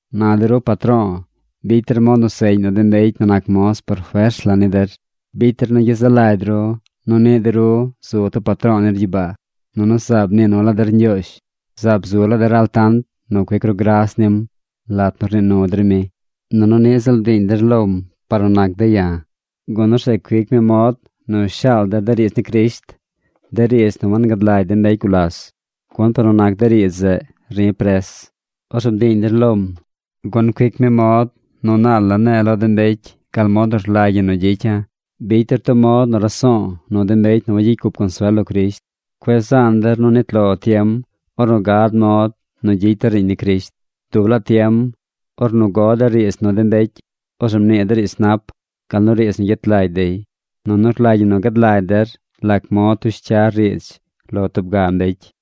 Na de ru patro̱o̱, bicy der mod nu seꞌñ nu de mbecy nu nac moz por fers la ni der. Bicy der nu gyezaꞌ lagy ru nu niꞌ de ru zu tub patro̱o̱ nir gyibaa. Nunu zaab mnii nu laa der Ñgyoozh. Zaab zu laa der altant nu cuic ru gras nim lat nu rnii nu der mi. Nunu niꞌ ziꞌl bdiiñ der lom par nu nac de̱ ya̱, gun orzeꞌ cuic mi mod nu shaal de̱ de riidz ni Crisht, de riidz nu wangad lagy de mbecy gulas. Gun par nu nac de riidz zeꞌ ri̱ pres. Orzeꞌ bdiiñ der lom, gun cuic mi mod nu naal la ne̱e̱ lo de mbecy gal mod nu rlagy ñi nu gyicya̱. Bicy der tub mod nu raso̱o̱ nu de mbecy nu wagyicy cup consuel lo Crisht. Cueꞌ zaan der nu nit lo tiem ornu gad mod nu gyicy der riiñ ni Crisht. Dub laa tiem, ornu go der riidz nu de mbecy, orzeꞌ mnii der riidz nap, gal nu riidz nu gyet lagy dey. Nunu rlagy ñi nu gad lagy der lac mod tush cyar riidz lo tub ga mbecy.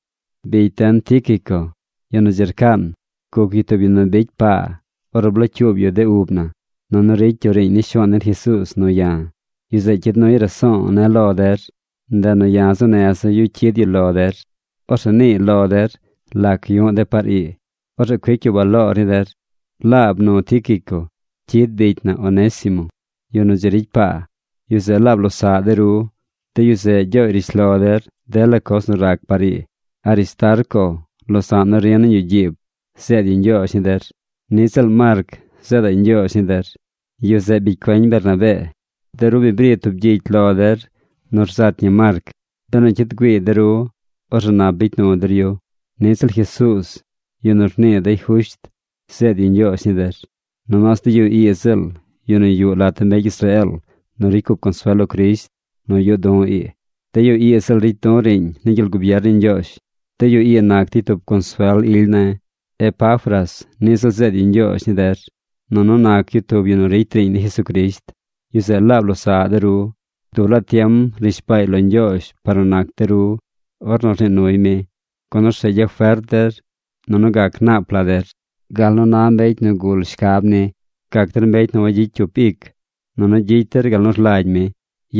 Bicy den Tíquico, yu nu dzi rcaan, guc yu tub yu nu bicy paa ornu blocyuub yu de ub na, nunu ricy yu riiñ ni Shuaan den Jesuuz nu ya̱. Yu zeꞌ cyid nuy raso̱o̱ ne̱ lo der. Ndeꞌ nu ya̱ zuu neza̱ yu cyid yu lo der. Orzeꞌ niiy lo der lac yu̱ꞌ de̱ par ii. Orzeꞌ cuic yu baloor ni der. Laab nu Tíquico cyid bicy na Onésimo, yu nu dzi ricy paa. Yu zeꞌ laab losaꞌ de ru. De yu zeꞌ gyooy rishlo der dela coz nu rac par ii. Aristarco, losa̱ꞌ nu ri̱ nañ yuꞌ gyiib, zeed yu ñgyoozh ni der. Niꞌ ziꞌl Marc zeedaꞌy ñgyoozh ni der. Yu zeꞌ bicy cueñ Bernabee. De ru bi bri tub gyicy lo der nu rzat ñi Marc. Benu cyid güiiy de ru, orzeꞌ nap bicy nu der yu. Niꞌ ziꞌl Jesuuz, yu nu rnii dey Jusht, zeed yu ñgyoozh ni der. Nomaas de yu ii ziꞌl yu nu yuꞌ lat de mbecy Israeel nu ricy cup consuel lo Crisht nu yuꞌ du̱ ii. De yu ii ziꞌl ricy du̱ riiñ ni gyel gubier ni Ñgyoozh. De yu ii nac dey tub consuel ily ne̱. Epafras niꞌ ziꞌl zeed yu ñgyoozh ni der, nunu nac yu tub yu nu ricy riiñ ni Jesucrisht. Yu zeꞌ laab losaꞌ de ru. Dub laa tiem rnishbaay lo Ñgyoozh par nu nac de ru ornu rnii nuy mi, gun orzeꞌ gyafert der, nunu gac nap la der, gal nu na mbecy nu gul shcab ni. Gac der mbecy nu wagyicy cyup ic, nunu gyicy der gal nu rlagy mi.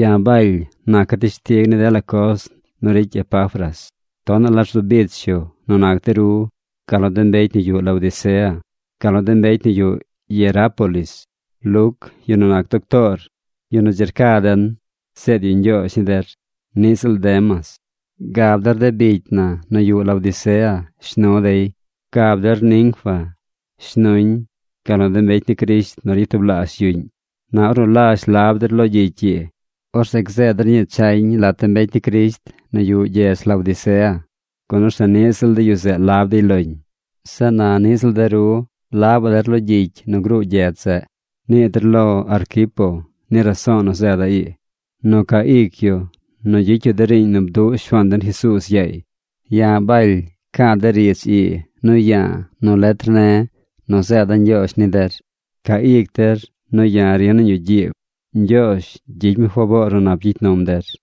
Ya̱ Baly naca̱ teshtig ni dela coz nu ricy Epafras. Tonaꞌ la rzu bich yu nu nac de ru gal nu de mbecy nu yuꞌ Laodicea, gal nu de mbecy nu yuꞌ Hierápolis. Luc, yu nu nac doctoor, yu nu dzi rca den, zeed yu ñgyoozh ni der. Niꞌ ziꞌl Demas. Gab der de bicy na nu yuꞌ Laodicea shnu dey. Gab der Ninfa shnuñ gal nu de mbecy ni Crisht nu ryatublaazh yuꞌñ. Na ornu lazh lab der lo gyicy ii, orzeꞌ gzeed der ñii chañ lat de mbecy ni Crisht nu yuꞌ gyedz Laodicea. Gun orzeꞌ niꞌ ziꞌl de yu zeꞌ lab dey loñ. Zeꞌ na niꞌ ziꞌl de ru labaꞌ der lo gyicy nu gruu gyedz zeꞌ. Nii der lo Arquipo ni raso̱o̱ nu zeeda̱ ii: nu ca ic yu nu gyicy yu de riiñ nu bduꞌ Shuaan den Jesuuz yaay. Ya̱ Baly ca̱a̱ de riidz ii nu ya̱a̱ nu letr ne̱ nu zeeda̱ ñgyoozh ni der: Ca ic der nu ya̱ ri̱ nañ yuꞌ gyiib. Ñgyoozh gyicy mi faboor nu nap gyicy num der.